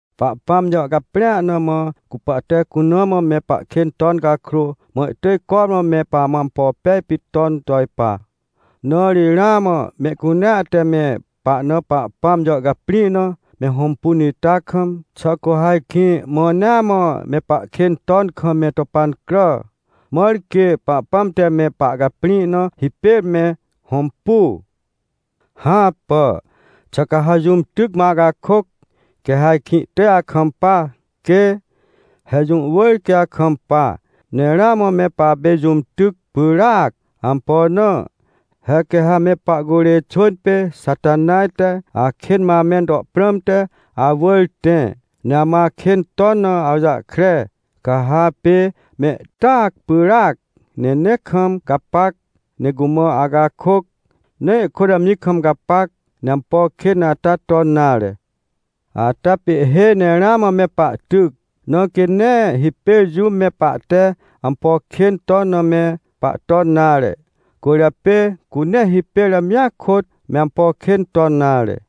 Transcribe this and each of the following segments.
Pahpãm jàhcaprĩa na mã, cu pahte cuna mã me pahkên ton cakrô, mã ihtỳj cormã me pamã ampo pej pit ton to ipa. Na ri ramã mehcunea te me pahna Pahpãm jàhcaprĩ na me hõmpun ita kam, xà cu ha ajkĩ mãnea mã me pahkên ton kam me to pancrà, mãr quê Pahpãm te me pahcaprĩ na hipêr me hõmpu? Hãpà! Xà ca ha jũm tyc mã acakôc, quê ha ajkĩ ihtỳj akampa? Quê! He jũ wỳr quê akampa. Ne ramã me papê jũm tyc pyràac. Ampo na? He quê ha me pahcurê xwỳn pê Xatanaj te akên mã amẽn to prãmte awỳr tẽ, ne amã akên ton na awjahkre, ca ha apê mehtyac pyràc, ne nee kam gapac, ne cumã acakôc, ne ihkôt amji kam gapac, ne ampo kên ata ton nare. Ata pê ihhêj ne ramã me pahtyc, na quê nee hipêr jũm me pahte ampo kên ton na me pahton nare. Cwỳrjapê cu nee hipêr amjia kôt me ampo kên ton nare.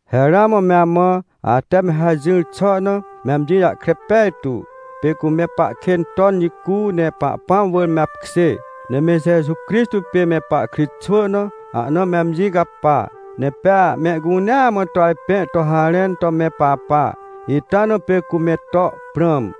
He ramã me amã, ate me hajỹr xà na, me amji jahkre pej tu. Pê cu me pahkên ton jicu, ne Pahpãm wỳr me apkjê, ne me Jeju Crixtô pê me pahkritxwỳ na ahna me amji capa, ne pea mehcunea mã to ajpẽ to harẽn to me papa, ita na pê cu me to prãm.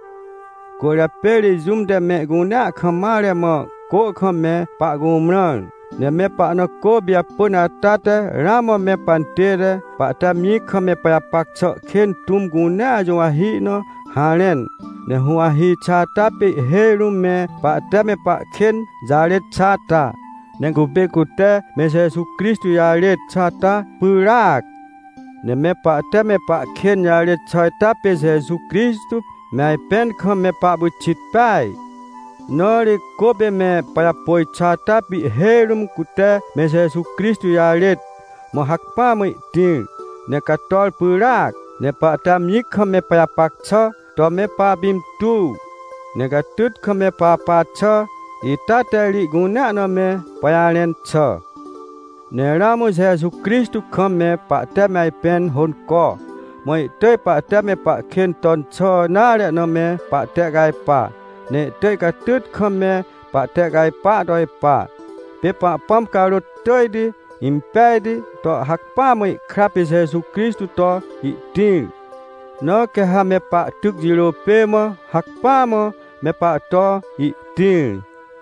Cwỳrjapê ri jũm te mehcunea kam mare mã cô kam me pahcumrãr. Ne me pahna cô pijapỳn ata te ramã me pantête, pahte amji kam me pajapac xà kên tũm cunea juwahi na harẽn. Ne huwahi xà ata pê ihhêj rũm me pahte me pahkên jarêt xà ata, ne cupê cute me Jeju Crixtô jĩ jarêt xà ata pyràac. Ne me pahte me pahkên jarêt xà ita pê Jeju Crixtô me ajpẽn kam me pahpyxit peaj. Na ri cô pê me pajapôj xà ata pê ihhêj rũm cute me Jeju Crixtô jarêt, mã hacpỹa mã ihtĩr, ne cator pyràac. Ne pahte amji kam me pajapac xà to me papintuw, ne catyt kam me papa xà ita te ri ihcunea na me pajarẽn xà. Ne ramã Jeju Crixtô kam me pahte me ajpẽn hônco, mã ihtỳj pahte me pahkên ton xà nare na me pahtehcajpa, ne ihtỳj catyt kam me pahtehcajpar to ipa. Pê Pahpãm carôt tỳjti impejti to hacpỹa mã ihkra pê Jeju Crixtô to ihtĩr, na quê ha me pahtyc jirô pê mã, hacpỹa mã me pahto ihtĩr.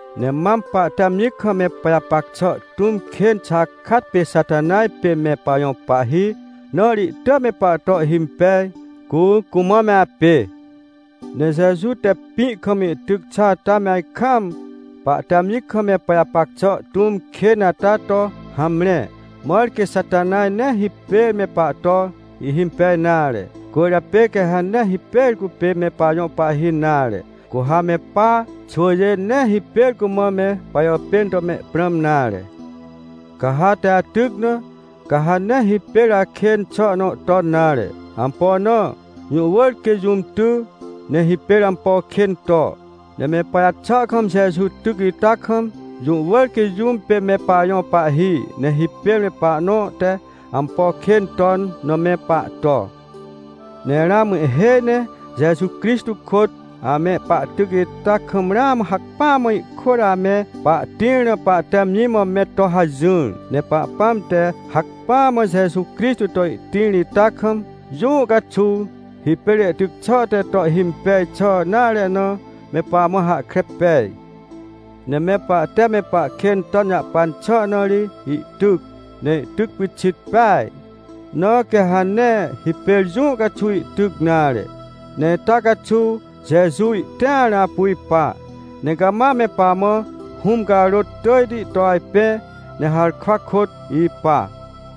Ne mam pahte amji kam me pajapac xà tũm kên xakat pê Xatanaj pê me pajõ pahhi, na ri ihtỳj me pahto ihhimpej, cu cumã me apê. Ne Jeju te pĩ kam ihtyc xà ata me ajkaam, pahte amji kam me pajapac xà tũm kên ata to hamre, mãr quê Xatanaj nee hipêr me pahto ihhimpej nare. Cwỳrjapê quê ha nee hipêr cupê me pajõ pahhi nare, cu ha me pa xwỳjê nee hipêr cumã me pajàpên to mehprãm nare. Ca ha ate atyc na, ca ha nee hipêr akên xà nõ ton nare. Ampo na? Jũ wỳr quê jũm ty, ne hipêr ampo kên to. Ne me pajaxà kam Jeju tyc ita kam, jũ wỳr quê jũm pê me pajõ pahhi, ne hipêr me pahnõ te ampo kên ton na me pahto. Ne ramã ihhêj ne Jeju Crixtô kôt ame pahtyc ita kam ramã hacpỹa mã ihkôt ame pahtĩr na pahte amji mã me to hajỹr. Ne Pahpãm te hacpỹa mã Jeju Crixtô to ihtĩr ita kam, jũũ caxuw hipêr ihtyc xà te to ihhimpej xà nare na, me pamã hahkre pej. Ne me pahte me pahkên ton jahpan xà na ri ihtyc. Ne ihtyc pyxit peaj, na quê ha nee hipêr jũũ caxuw ihtyc nare. Ne ita caxuw Jeju ihtĩar na apu ipa, ne cama me pamã Hũm carôt tỳjti to ajpẽ, ne harkwa kôt ipa.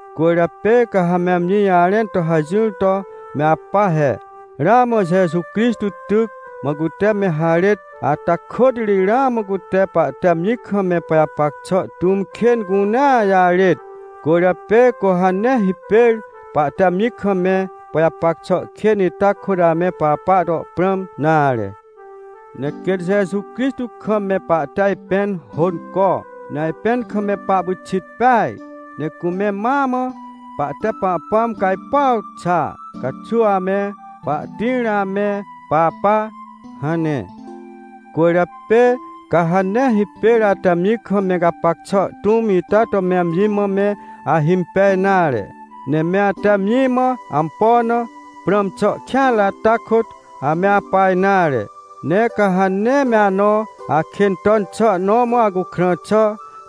Cwỳrjapê ca ha me amji jarẽn to hajỹr to me apa he: — Ramã Jeju Crixtô tyc, mã cute me harêt, ata kôt ri ramã cute pahte amji kam me pajapac xà tũm kên cunea jarêt. Cwỳrjapê cu ha nee hipêr pahte amji kam me pajapac xà kên ita kôt ame papa to prãm nare. Ne quêt Jeju Crixtô kam me pahte ajpẽn hônco, ne ajpẽn kam me pahpyxit peaj, ne cume mãa mã pahte Pahpãm cajpuaw xà caxuw ame pahtĩar na ame papa — hane. Cwỳrjapê ca ha nee hipêr ate amji kam me gapac xà tũm ita to me amji mã me ahimpej nare, ne me ate amji mã ampo na prãm xà kêanre ata kôt ame apa nare. Ne ca ha nee me anõ akên ton xà nõ mã acukrã xà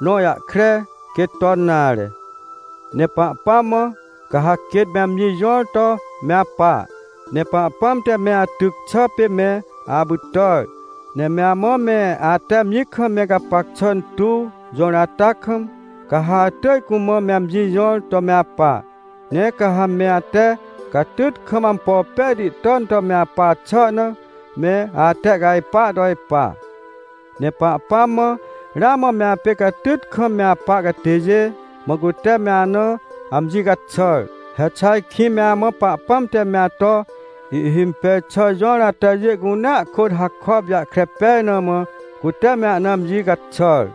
nõ jahkre, quê ton nare. Ne Pahpãm mã, ca ha quêt me amji jõr to me apa. Ne Pahpãm te me atyc xà pê me apytàr, ne me amã me ate amji kam me gapac xà tuw jõr ata kam, ca ha atỳj cumã me amji jõr to me apa. Ne quê ha me ate catyt kam ampo pejti ton to me apa xà na, me atehcajpar to ipa. Ne Pahpãm mã, ramã me apê catyt kam me apa catêjê, mã cute me ana amji caxàr. He xà ajkĩ me amã Pahpãm te me ato ihhimpej xà jõr atajê cunea kôt hakop jahkre pej na mã, cute me ana amji caxàr?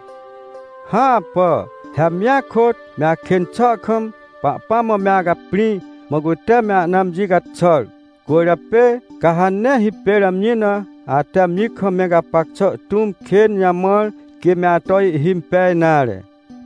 Hãpà! He amjia kôt, me akên xà kam, Pahpãm mã me acaprĩ, mã cute me ana amji caxàr. Cwỳrjapê ca ha nee hipêr amji na ate amji kam me gapac xà tũm kên jamãr, quê me ato ihhimpej nare.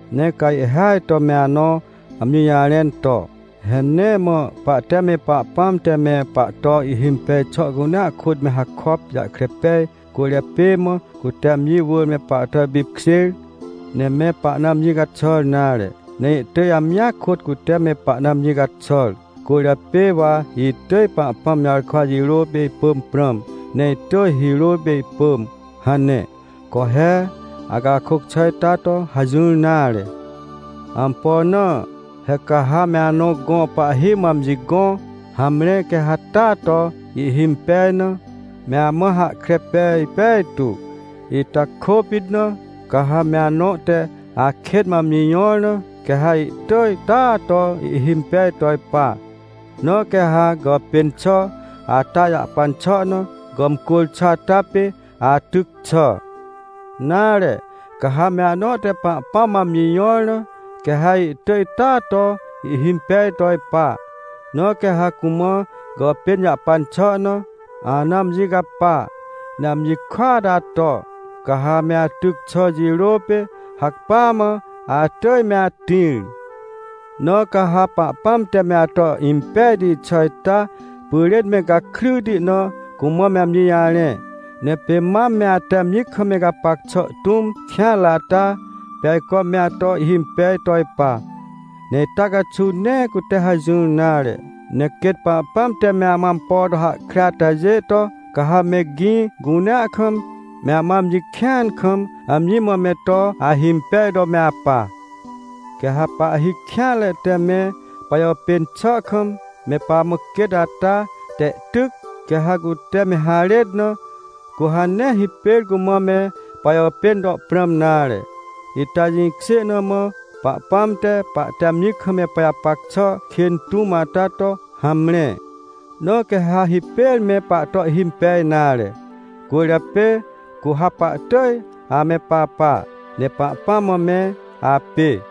Ne ca ihhêaj to me anõ amji jarẽn to: — He nee mã pahte me Pahpãm te me pahto ihhimpej xà cunea kôt me hakop jahkre pej cwỳrjapê mã, cute amji wỳr me pahto ipipkjêr, ne me pahna amji caxàr nare, ne ihtỳj amjia kôt cute me pahna amji caxàr. Cwỳrjapê wa itỳj Pahpãm jarkwa jirô pê ipỳm prãm, ne itỳj hirô pê ipỳm — hane. Co he! Acakôc xà ita to hajỹr nare! Ampo na? He ca ha me anõ gõ pahhi mã amji gõ, hamre quê ha taa ato ihhimpej na, me amã hahkre pej pejtu. Ita kôpit na, ca ha me anõ te akên mã amji jõr na, quê ha ihtỳj taa ato ihhimpej to ipa. Na quê ha gàpên xà ata jahpan xà na gàmcwỳr xà ata pê atyc xà. Nare, ca ha me anõ te Pahpãm mã amji jõr na, quê ha ihtỳj taa ato ihhimpej to ipa. Na quê ha cumã gàpên jahpan xà na ana amji capa, ne amji kôat ato, ca ha me atyc xà jirô pê, hacpỹa mã atỳj me atĩr. Na ca ha Pahpãm te me ato impejti xà ita pyrên me gakryti na cumã me amji jarẽ. Ne pê mam me ate amji kam me gapac xà tũm kêanre ata, pê ajco me ato ihhimpej to ipa. Ne ita caxuw nee cute hajỹr nare, ne quêt Pahpãm te me amã ampo to hahkre atajê to, ca ha me gĩ cunea kam, me amã amji kĩan kam, amji mã me to ahimpej to me apa. Quê ha pahhi kêanre te me pajàpên xà kam me pamã quêt ata te ihtyc, quê ha cute me harêt na, cu ha nee hipêr cumã me pajàpên to prãm nare. Ita jĩkjê na mã Pahpãm te pahte amji kam me pajapac xà kên tũm ata to hamre, na quê ha hipêr me pahto ihhimpej nare. Cwỳrjapê cu ha pahtỳj ame papa, ne Pahpãm mã me apê.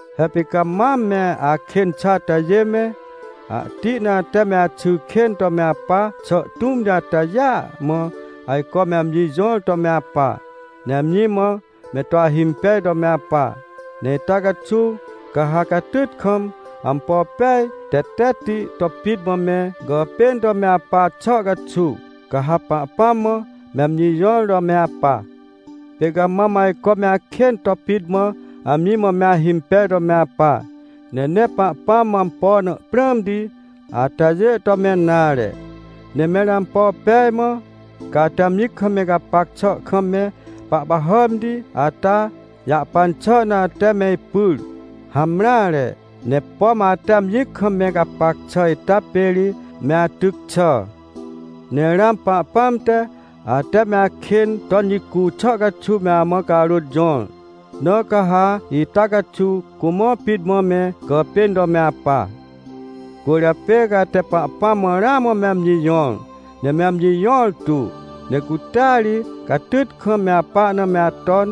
He pê ca mam me akên xà atajê me, ahti na ate me axy kên to me apa xà tũmti atajêa mã, ajco me amji jõr to me apa, ne amji mã me to ahimpej to me apa. Ne ita caxuw, ca ha catyt kam, ampo pej tetetti to pit mã me gàpên to me apa xà caxuw, ca ha Pahpãm mã me amji jõr to me apa. Pê ca mam ajco me akên to pit mã, amji mã me ahimpej to me apa, ne nee Pahpãm mã ampo na prãmti atajê ton to me apa nare. Ne mẽr ampo pej mã, ca ate amji kam me gapac xà kam me pahpahàmti ata jahpan xà na ate me ipyr? Hamreare! Ne pom ate amji kam me gapac xà ita pê ri me atyc xà. Ne ramã Pahpãm te, ate me akên ton jicu xà caxuw me amã carôt jõr. Na ca ha ita caxuw cumã pit mã me gàpên to me apa. Cwỳrjapê ca ate Pahpãm mã ramã me amji jõr, ne me amji jõrtu, ne cutea ri catyt kam me apa na me aton,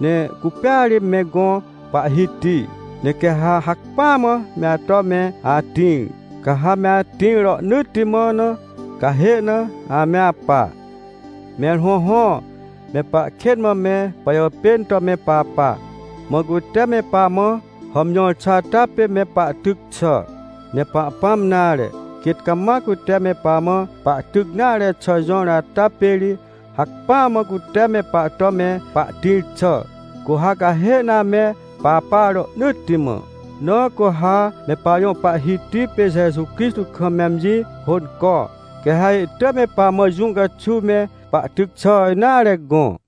ne cupêa ri me gõ Pahhiti. Ne quê ha hacpỹa mã me ato me atĩr, ca ha me atĩr rohnỳtti mã na, cahê na ame apa. Mẽr hõhõ, me pahkên mã me pajàpên to me papa, mã cute me pamã hàmjõr xà ata pê me pahtyc xà. Ne Pahpãm nare, quêt cama cute me pamã pahtyc nare xà jõr ata pê ri hacpỹa mã cute me pahto me pahtĩr xà, cu ha cahê na ame papa rohnỳtti mã. Na cu ha me pajõ Pahhiti pê Jeju Crixtô kam me amji hônco, quê ha ihtỳj me pamã jũ caxuw me pahtyc xà nare gõ.